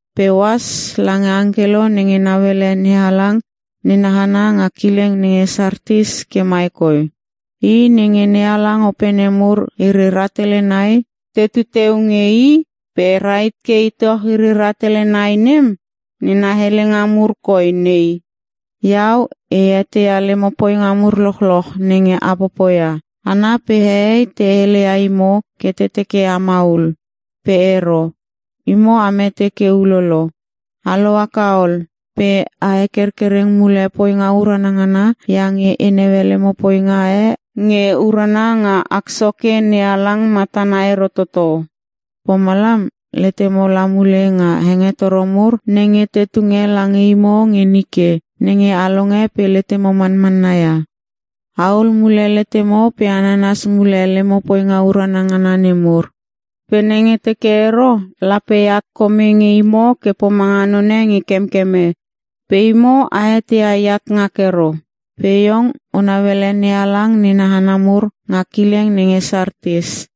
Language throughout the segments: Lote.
“Pe ohas lange angkelo nenge nauele NeHalang nena hana nga kileng nenge Sartis ke mai koi: I nenge NeHalang opene mur iri rahtele nai tetu teu nge I, pe rahit ke itoch iri rahtele nai nem, nena helenga mur koi nei: Iau e eteia lemo poinga mur lochloch nenge a popoia. Hana pe hehei te hele ia imo ke te teke a maul. Pe ero. Imo a mete ke ulolo. A lohaka ol! Pe a hekerkereng mule poinga urana ngana iange e naue lemo poinga e nge urana nga Ak Soke NeHalang matana ero toto. Pomalam, letemo la mule nga hengetoro mur nenge te tunge lange imo nge nike nenge a longe pe letemo manmanna ia. Ahul mule letemo pe a nanas mule lemo poinga urana ngana nemur. Pe nenge teke ero, lape eat kome nge imo ke pomanga none nge kemkeme. Pe imo a eteia eat ngak ero. Pe iong o nauele NeHalang nena hana mur nga kileng nenge Sartis.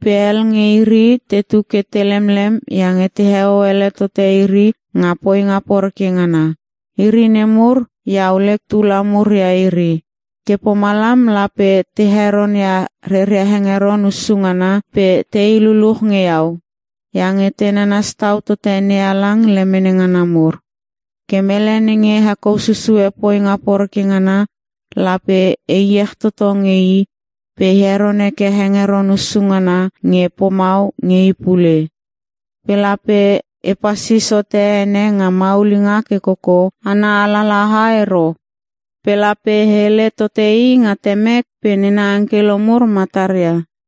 Pe hel nge iri tetu ke te lemlem iange teheo ele tote iri nga poinga poreke ngana. Iri nemur iau lek tula mur ia iri. Ke pomalam lape te heronia reria hengeron hussu ngana pe tei luluch nge Iau, iange te nanas tau tote NeHalang lemene ngana mur. Ke mele nenge hekou susue poinga poreke ngana lape e iech toto nge i pe e heron heke hengeron hussu ngana nge pomau nge i pule. Pe lape e pasis hote ene nga maulinga ke koko ana alalaha ero. Pe lape e hele tote i nga Temek pe nena angkelo mur mataria.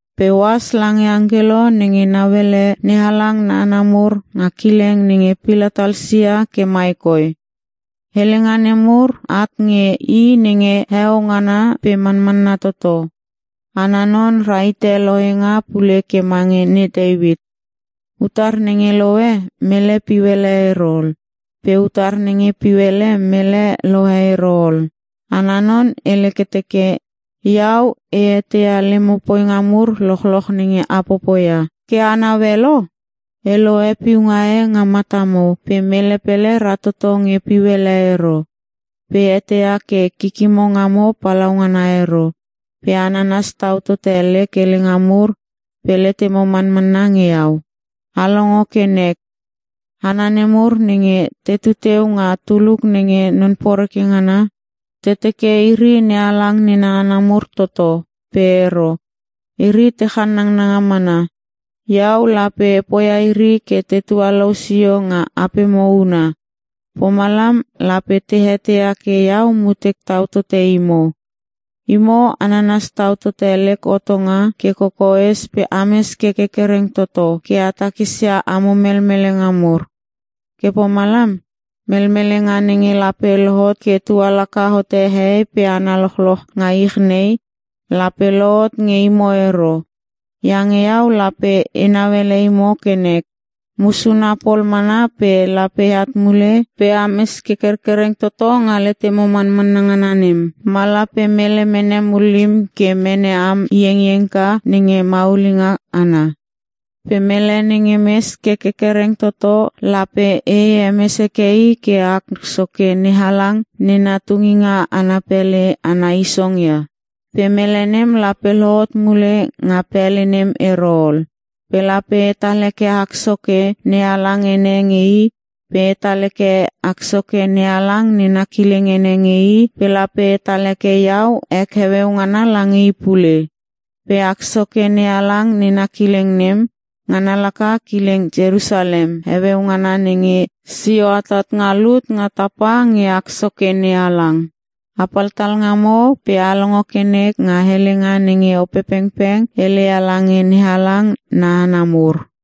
“Pe ohas lange angkelo nenge nauele NeHalang na hana mur nga kileng nenge Pilatalsia ke mai koi: Helenga nemur at nge I nenge heo ngana pe manmanna toto. Ana non rahite lohenga pule ke mange ne Teuit. Utar nenge lohe, mele piu ele ero ol pe utar nenge piu ele, mele lohe ero ol. Ana non hele ke teke: Iau e eteia lemo poinga mur lochloch nenge a popoia. Ke e naue lo? E lohe piunga e nga matamo pe mele pele ratoto nge piu ele ero. Pe e eteia ke kikimo ngamo palaungana ero pe a nanas tau tote lek helenga mur pe letemo manmanna nge iau. A longo ke nek. Hana nemur nenge tetu teu nga tuluk nenge non poreke ngana, te teke iri NeHalang nena hana mur toto pe ero. Iri te channanga mana. Iau lape e poia iri ke te tualou sio nga apemo huna. Pomalam lape te eteia ke iau mutek tau tote imo. Imo a nanas tau tote lek hotonga ke kokoes pe ames ke kerkereng toto ke a takisia amo melmelenga mur. Ke pomalam, melmelenga nenge lape lohot ke tualaka hote hehei pe hana lochloch nga ich nei, lape lohot nge imo ero. Iange iau lape enau ele imo ke nek. Musuna pol mana pe lape eat mule pe ames ke kerkereng toto nga letemo manmanna ngana nem, ma lape mele mene mullim ke mene am iengiengka nenge maulinga ana. Pe mele nenge mes ke kerkereng toto lape e hemes heke i ke Ak Soke NeHalang nena tunginga ana pele ana isong ia. Pe mele nem lape lohot mule nga pele nem ero ol. Pe lape etal heke Ak Soke NeHalang ene nge i pe etal heke Ak Soke NeHalang nena kileng ene nge i pe lape etal heke iau ek heueu ngana lange i pule. Pe Ak Soke NeHalang nena kileng nem, ngana laka kileng Ierusalem heueu ngana nenge sio atat nga lut nga tapa nge Ak Soke NeHalang. “Apal talngamo pe a longo ke nek nga helenga nenge Opepengpeng heleia lange NeHalang na hana mur.”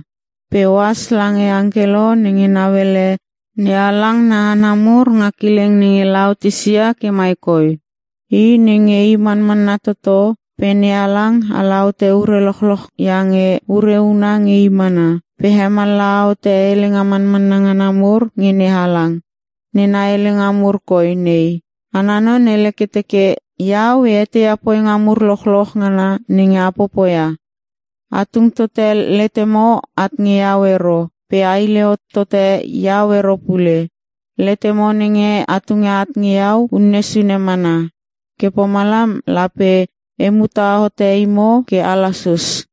“Pe ohas lange angkelo nenge nauele NeHalang na hana mur nga kileng nenge Laotisia ke mai koi: I nenge i Manmanna Toto pe NeHalang ala hote ure lochloch iange ure huna nge i mana, pe hemallaha hote helenga manmanna ngana mur nge NeHalang, nena helenga mur koi nei: Ana non hele ke teke: Iau e eteia poinga mur lochloch ngana nenge a popoia. A tung tote letemo at nge iau ero pe a hile hot tote iau ero pule. Letemo nenge a tunge at nge Iau unne sune mana. Ke pomalam lape e muta hote imo ke a lasus.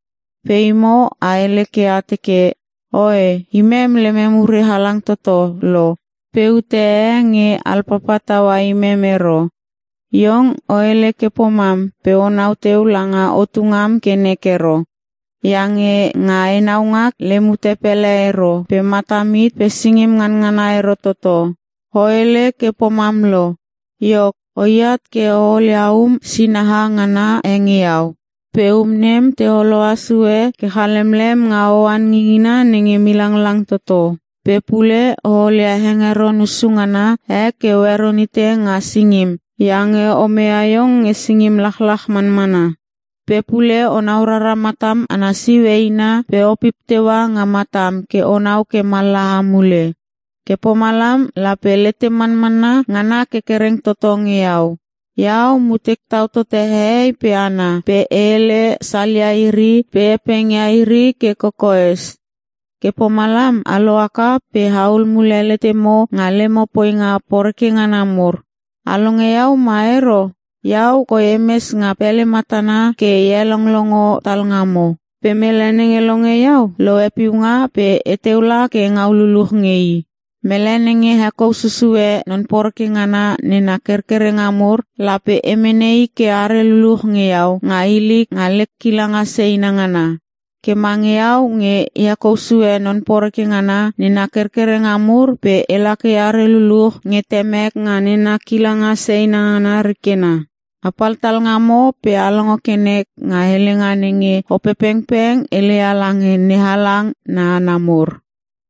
Pe imo a hele ke a teke, ‘Oe imem lemem ure halang toto lo pe ute e nge alpapa taua imem ero.’ Iong o hele ke pomam pe onau teu langa otu ngam ke nek ero. Iange nga enau ngak lem ute pele ero pe matam hit pe singim nganangana ero toto. O hele ke pomam lo, iok oi at ke o olia um sinaha ngana e nge iau. Pe um nem te holoa sue ke chalemlem nga oan ngingina nenge milanglang toto. Pe pule o olia hengeron hussu ngana e ke o heron hite nga singim iange o meia iong nge singim lachlach manmana. Pe pule onau rara matam ana siu eina pe opip teua nga matam ke onau ke mallaha mule. Ke pomalam lape letem manmanna ngana kerkereng toto nge iau. Iau mutek tau totote hehei pe hana pe e hele salia iri pe e hepengia iri ke kokoes. Ke pomalam a lohaka pe ahul mule letemo nga lemo poinga poreke ngana mur. A longe Iau ma ero? Iau koi emes nga pele matana ke e helonglongo talngamo. Pe mele nenge longe iau, lohe piunga pe eteu kela engau luluch nge i. Mele nenge hekou susue non poreke ngana nena kerkerenga mur lape e mene i ke are luluch nge iau nga ilik nga lek kilanga seina ngana. Ke mange iau nge e hekou sue non poreke ngana nena kerkerenga mur pe ela ke eare luluch nge Temek nga nena kilanga seina ngana rikena. “Apal talngamo pe a longo ke nek nga helenga nenge Opepengpeng heleia lange NeHalang na hana mur.”